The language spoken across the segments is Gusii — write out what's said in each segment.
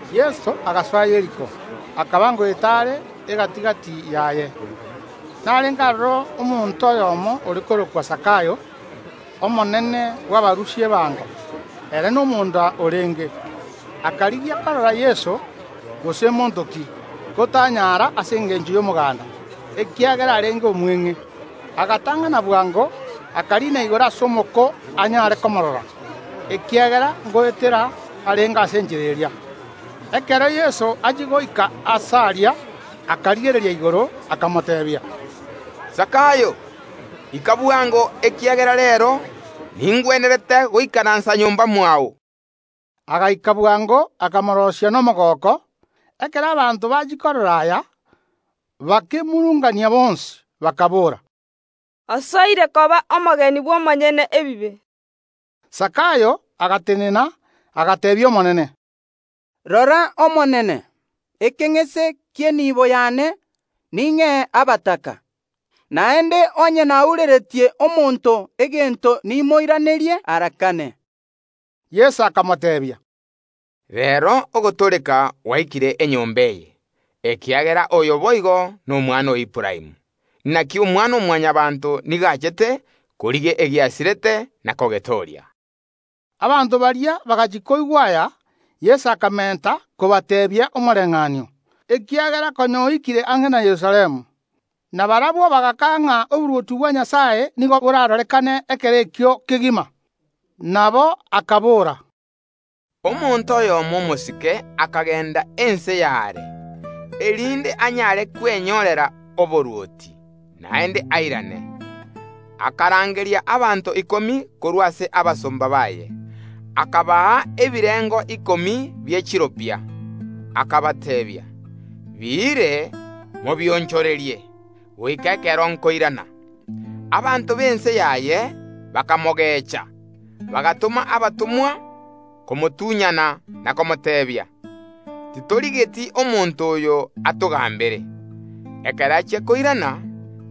Yeso agasoa Yeriko, akaba ngoeta are egati‐gati yaye. Narenge aroro omonto oyomo ore korokwa Zakayo, omonene bw’abarusia ebango; ere nomonda orenge. Akarigia korora Yeso, gose ’monto ki; ko tanyara ase engencho y’omoganda, ekiagera arenge omweng’e. Agatang’ana bwango, akariina igoro ase omoko anyare komorora, ekiagera ngoetera arenge ase enchera eria. Ekero Yeso achia goika aase aria, akarigereria igoro, akamoteebia, “Zakayo, ika bwango, ekiagera reero ningwenerete goikaransa nyomba mwao.” Agaika bwango, akamoroisia nomogooko. Ekero abanto bachia korora aya, bakemurungania bonsi, bakobora, “Osoire koba omogeni bw’omonyene ebibe.” Zakayo agatenena, agateebia Omonene, “Rora, Omonene, ekeng’ese ki’enibo yane ning’ee abataka; naende onye naureretie omonto egento nimoiranerie ara kane.” Yeso akamoteebia, “Reero ogotooreka gwaikire enyomba eye, ekiagera oyo boigo nomwana o Aburaamu. Naki Omwana‐o‐Mwanyabaanto nigo achete korigia egiasirete na kogetooria.” Abanto baria bagachia koigwa aya, Yeso akamenta kobateebia omoreng’anio, ekiagera konya oikire ang’e na Yerusalemu, na barabwo bagakaga ng’a oborwoti bwa Nyasae nigo borarorekane ekero ekio kegima. Nabo akabora, “Omonto oyomo omosike akagenda ense y’aare, erinde anyare kwenyorera oborwoti, naende airane. Akarangeria abanto ikomi korwa ase abasomba baye, akabaa ebirengo ikomi bie chiropia, akabateebia: Biire mobionchorerie goika ekero nkoirana. Abanto b’ense yaye bakamogecha, bagatoma abatomwa komotunyana na komoteebia, Titorigeti omonto oyo atogambere. “Ekero achia koirana,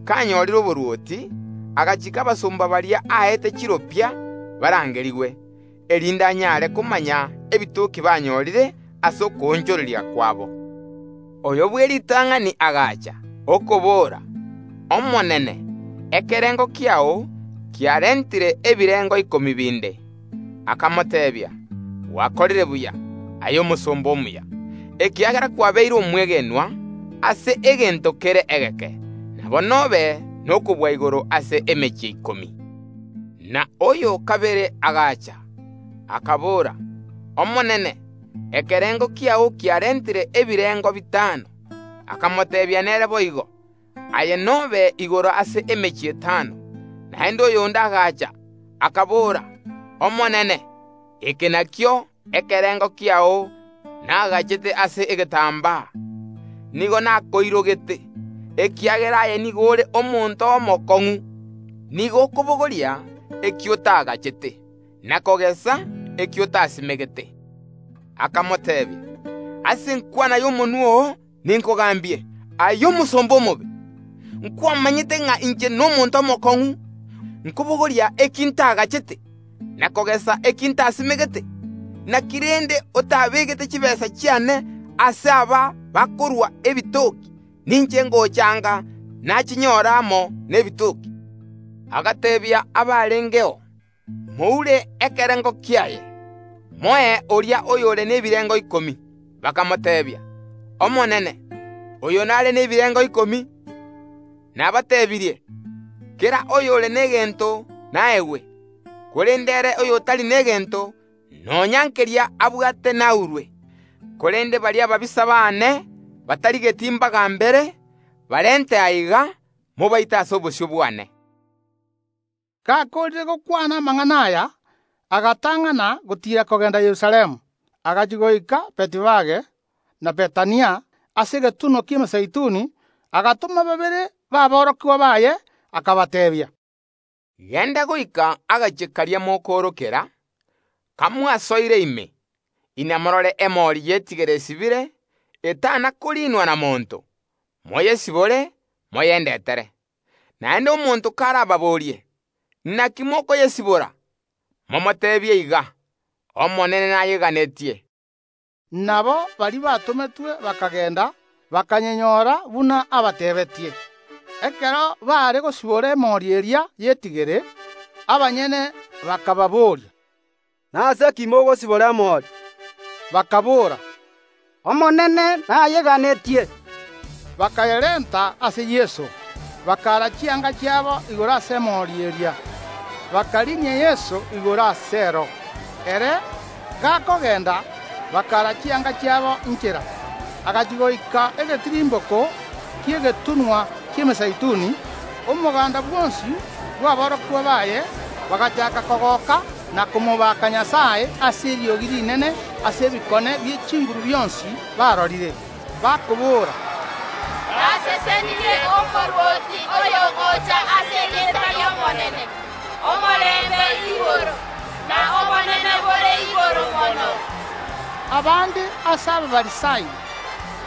kanyorire oborwoti, agachiika abasomba baria aete chiropia barangerigwe, erinde anyare komanya ebitoki banyorire ase okoonchoreria kwabo. Oyo bw’eritang’ani agacha, okobora: Omonene, ekerengo kiao kiarentire ebirengo ikomi binde. Akamoteebia: Gwakorire buya, aye omosomba omuya! Ekiagera kwabeire omwegenwa ase egento kere egeke, nabo nobe nokobua igoro ase emechie ikomi. Na oyo o kabere agacha, akabora: Omonene, ekerengo kiao kiarentire ebirengo bitano. Akamoteebia nere boigo: Aye nobe igoro ase emechie etano. Naende oyonde agacha, akabora: Omonene, eke nakio ekerengo kiao nagachete ase egetambaa; nigo nakoirogete, ekiagera aye nigo ore omonto omokong’u. Nigo okobogoria eki otagachete, na kogesa eki otasimegete. Akamoteebia: Ase enkwana y’omonwa oo ninkogambie, aye omosomba omobe. Nkwamanyete ng’a inche nomonto omokong’u, nkobogoria eki ntagachete, na kogesa eki ntasimegete. Naki rende otabeegete chitaabu chiane ase aba bakorua ebitoki, ninche ngocha anga nachinyora amo nebitoki? Agateebia abarengeo: Moure ekerengo kiaye, moe oria oyore nebirengo ikomi. (Bakamoteebia: Omonene, oyo nare nebirengo ikomi). Nabatebirie: Kera oyore negento naegwe, korende ere oyotari negento, nonya nkeria abwate naurwe. Korende baria ababisa baane batarigeti mbagambere, barente aiga, mobaite ase obosio bwane.” Gakoorire gokwana amang’ana aya, agatang’ana gotiira kogenda Yerusalemu. Agachia goika Betifage na Bethania, ase egetunwa ki’Emezeituni, agatoma babere baborokigwa baye, akabateebia, Genda goika agachie karia mokoorokera; kamwasoire ime, inamorore emori y’etigere esibire, etana koriinwa na monto; moyesibore moyendetere. Naende omonto karababorie: Naki, mokoyesibora? Momoteebie iga, “Omonene nayeganetie.” Nabo baria batometwe bakagenda, bakayenyora buna abateebeetie. Ekero baare gosibora emori eria y’etigere, abanyene bakababoria, “Nase ki mogosibora emori?” Bakaboora, “Omonene nayeganetie.” Bakayerenta ase Yeso; bakaara chianga chiabo igoro ase emori eria, bakariinia Yeso igoro aseero. Ere gakogenda, bakaara chianga chiabo inchera. Agachia goika egetirimboko ki’egetunwa ki’Emezeituni, omoganda bwonsi bw’aborokigwa baye bagachaaka kogooka na komobaka Nyasae ase eriogi rinene ase ebikone bie chinguru bionsi barorire, bakobora, “Nasesenirie Omorwoti oyogocha ase erieta ri’Omonene! Omorembe igoro, na obonene bore igoro mono!” Abande ase Abafarisai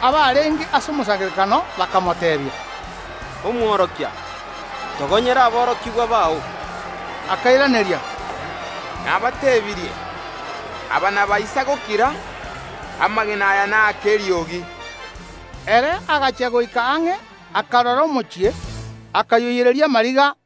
abarenge ase omosangererekano bakamoteebia, “Omworokia, togonyera aborokigwa bao!” Akairaneria, “Nabatebirie: Aba nabaisa gokira, amagena aya naake eriogi.” Ere agachia goika ang’e akarora omochie, akayoiyereria amariga,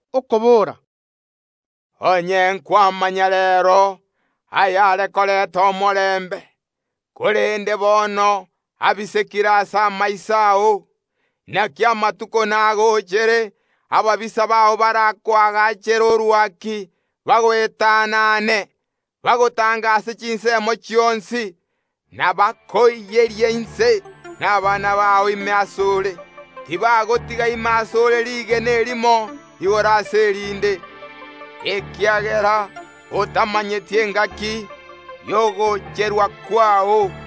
okobora, “Onye nkwamanya reero ayare korenta omorembe! Korende bono abisekire ase amaiso ao! Naki amatuko nagochere, ababisa bao barakoagachere orwaki bagoetanane, bagotangerane ase chinsemo chionsi, na bakoiyerie inse, na abana bao ime ase ore. Tibagotiga ime ase ore riigena erimo igoro ase erinde, ekiagera otamanyeti engaki y’ogocherwa kwao.”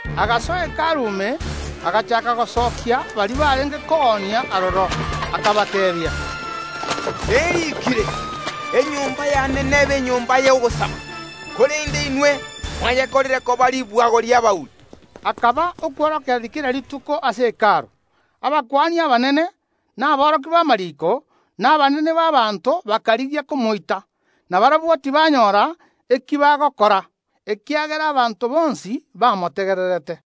Agasoa Hekalu ime, agachaaka gosokia baria barenge koonia aroro, akabateebia, “Neriikire: Enyomba yane nebe enyomba y’ogosaba, korende inwe mwayekorire koba ribwago ri’abauri.” Akaba okworokereria kera rituko ase Hekalu. Abakuani abanene, na aborokia b’amariiko, na abanene b’abaanto bakarigia komoita; na barabwo tibanyora eki bagokora, ekiagera abanto bonsi bamotegererete.